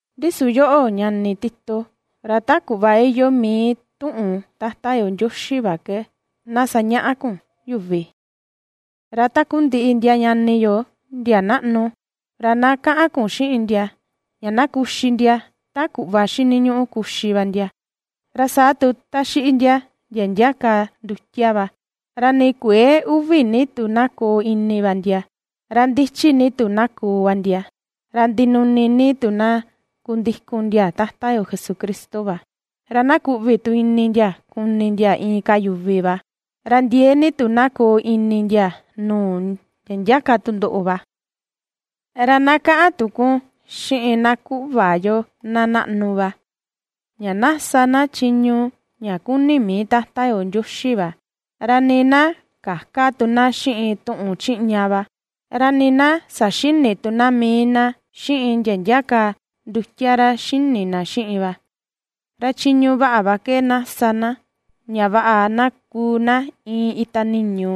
Ndi su yoꞌo, ñani Tito, ra ta kuꞌva iyoo mii tuꞌun Tata yo Ndioxi va ke na sañaꞌa kun yuvi. Ra takundiꞌi ndia ñani yo ndia naꞌnu, ra na kaꞌan kun xiꞌin ndia ña na kuxi ndia ta kuꞌva xiniñuꞌu kuxi va ndia, ra saa tu ta xiꞌi ndia, ndia ndia ka ndutia va, ra ni kuëe uvi ni tu na koo ini va ndia, ra ndichi ni tu na koo va ndia, ra ndinuni ni tu na kundikun ndia Tata yo Jesucristo va, ra na kuꞌvi tu ini ndia kuni ndia inka yuvi va, ra ndiee ni tu na koo ini ndia nuu ndia ndia ka tundoꞌo va. Ra na kaꞌan tu kun xiꞌin takundiꞌi na kuꞌva yo na naꞌnu va, ña na ^sa na chiñu ña kuni mii Tata yo Ndioxi va, ra nii na käka tu na xiꞌin tuꞌun chiꞌña va, ra nii na saxïni tu na mii na xiꞌin ndia ndia ka ndutia ra xini na xiꞌin va. Ra chiñu vaꞌa va ke na sa na, ña vaꞌa na kuu na iin ita niñu,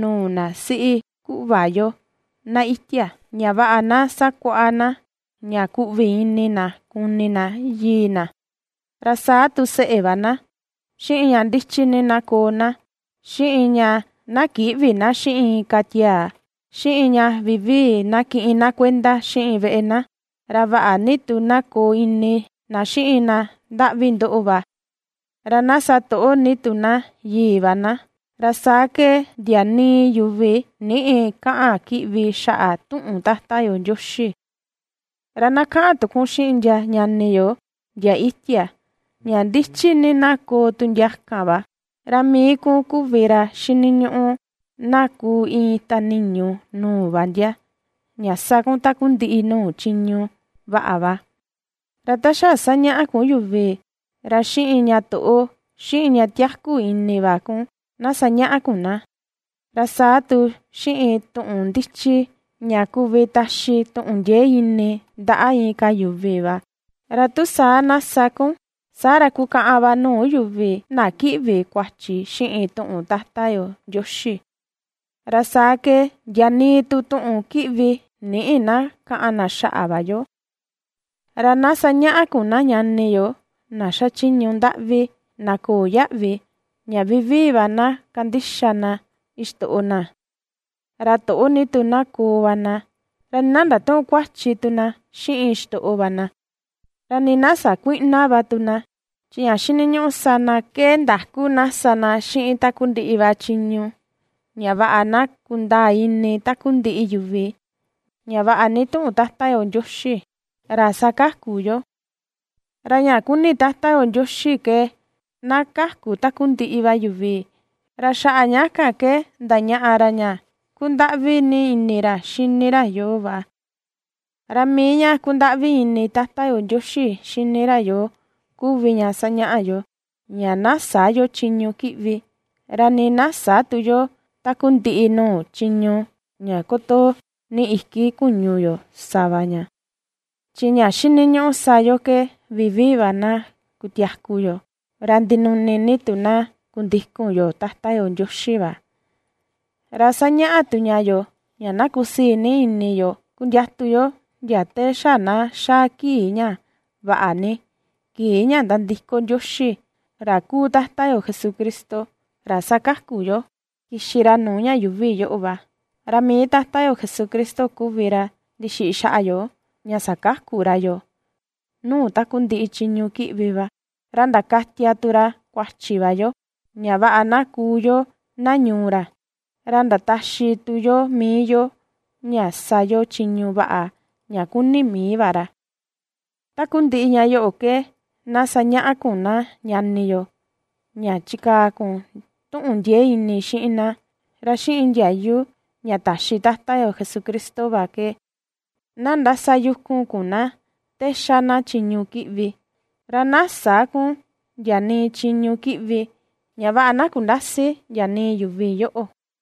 nuu na siꞌi kuꞌva yo, na itia, ña vaꞌa na sakuaꞌa na ña kuꞌvi ini na kuni na yii na, ra saa tu seꞌe va na, xiꞌin ña ndichi ni na koo na, xiꞌin ña na kïꞌvi na xiꞌin inka tiaa, xiꞌin ña vivii na kiꞌin na kuenda xiꞌin veꞌe na, ra vaꞌa ni tu na koo ini na xiꞌin na ndaꞌvi ndoꞌo va, ra na satoꞌo ni tu na yii va na, ra saa ke ndia nii yuvi nïꞌi kaꞌan kiꞌvi xaꞌa tuꞌun Tata yo Ndioxi. Ra na kaꞌan tu kun xiꞌin ndia ñani yo ndia itia, ña ndichi ni na koo tu ndia kan va, ra mii kun kuvi ra xiniñuꞌu na kuu iin ita niñu nuu va ndia, ña sa kun takundiꞌi nuu chiñu vaꞌa va. Ra ta xa sañaꞌa kun yuvi, ra xiꞌin ña toꞌo, xiꞌin ña tiaku ini va kun, na sañaꞌa kun na, ra saa tu xiꞌin tuꞌun ndichi ña kuvi taxi tuꞌun ndiee ini ndaꞌa inka yuvi va. Ra tu saa na sa kun, saa ra kukaꞌan va nuu yuvi na kiꞌvi kuachi xiꞌin tuꞌun Tata yo Ndioxi, ra saa ke ndia nii tu tuꞌun kiꞌvi nïꞌi na kaꞌan na xaꞌa va yo. Ra na sañaꞌa kun na ñani yo na xachiñu ndaꞌvi köo yaꞌvi, ña vivii va na kandixa na xitoꞌo na; ra toꞌo ni tu na koo va na, ra nii na ndatüꞌun kuachi tu na xiꞌin xitoꞌo va na. Ra nii na sakuïꞌna va tu na, chi ña xiniñuꞌu sa na ke ndaku na sa na xiꞌin takundiꞌi va chiñu, ña vaꞌa na kundaa ini takundiꞌi yuvi, ña vaꞌa ni tuꞌun Tata yo Ndioxi, ra ^sakaku yoo. Ra ña kuni Tata yo Ndioxi ke na kaku takundiꞌi va yuvi, ra xaꞌa ña ke ndañaꞌa ra ña kundaꞌvi ni ini ra xini ra yoo va. Ra mii ña kundaꞌvi ini Tata yo Ndioxi xini ra yoo kuvi ña sañaꞌa yoo, ña na sä yo chiñu kiꞌvi, ra nii na sä tu yo takundiꞌi nuu chiñu ña kutoo ni iki kuñu yo sa va ña, chi ña xiniñuꞌu sa yo ke vivii va na kutiaku yo, ra ndinuni ni tu na kundikun yo Tata yo Ndioxi va. Ra sañaꞌa tu ña yoo, ña na kusii ni ini yo kundiatu yo ndia te xa na xaa kii ña vaꞌa ni, kii ña nandiko Ndioxi, ra kuu Tata yo Jesucristo, ra ^sakaku yoo, kixi ra nuu ña yuuvi yoꞌo va. Ra mii Tata yo Jesucristo kuvi ra ndixiꞌi xaꞌa yo, ña sakaku ra yoo nuu takundiꞌi chiñu kiꞌvi va, ra ndakatia tu ra kuachi va yo, ña vaꞌa na kuu yo na ñuu ra, ra ndataxi tu yo mii yo ña sa yo chiñu vaꞌa ña kuni mii va ra. Takundiꞌi ña yoꞌo ke na sañaꞌa kun na ñani yo, ña chikaa kun tuꞌun ndiee ini xiꞌin na, ra xiꞌin ndiayu ña taxi Tata yo Jesucristo va ke na ndasayukun kun na te ^xa na chiñu kiꞌvi. Ra na sä kun ndia nii chiñu kiꞌvi, ña vaꞌa na kundäsi ndia nii yuvi yoꞌo.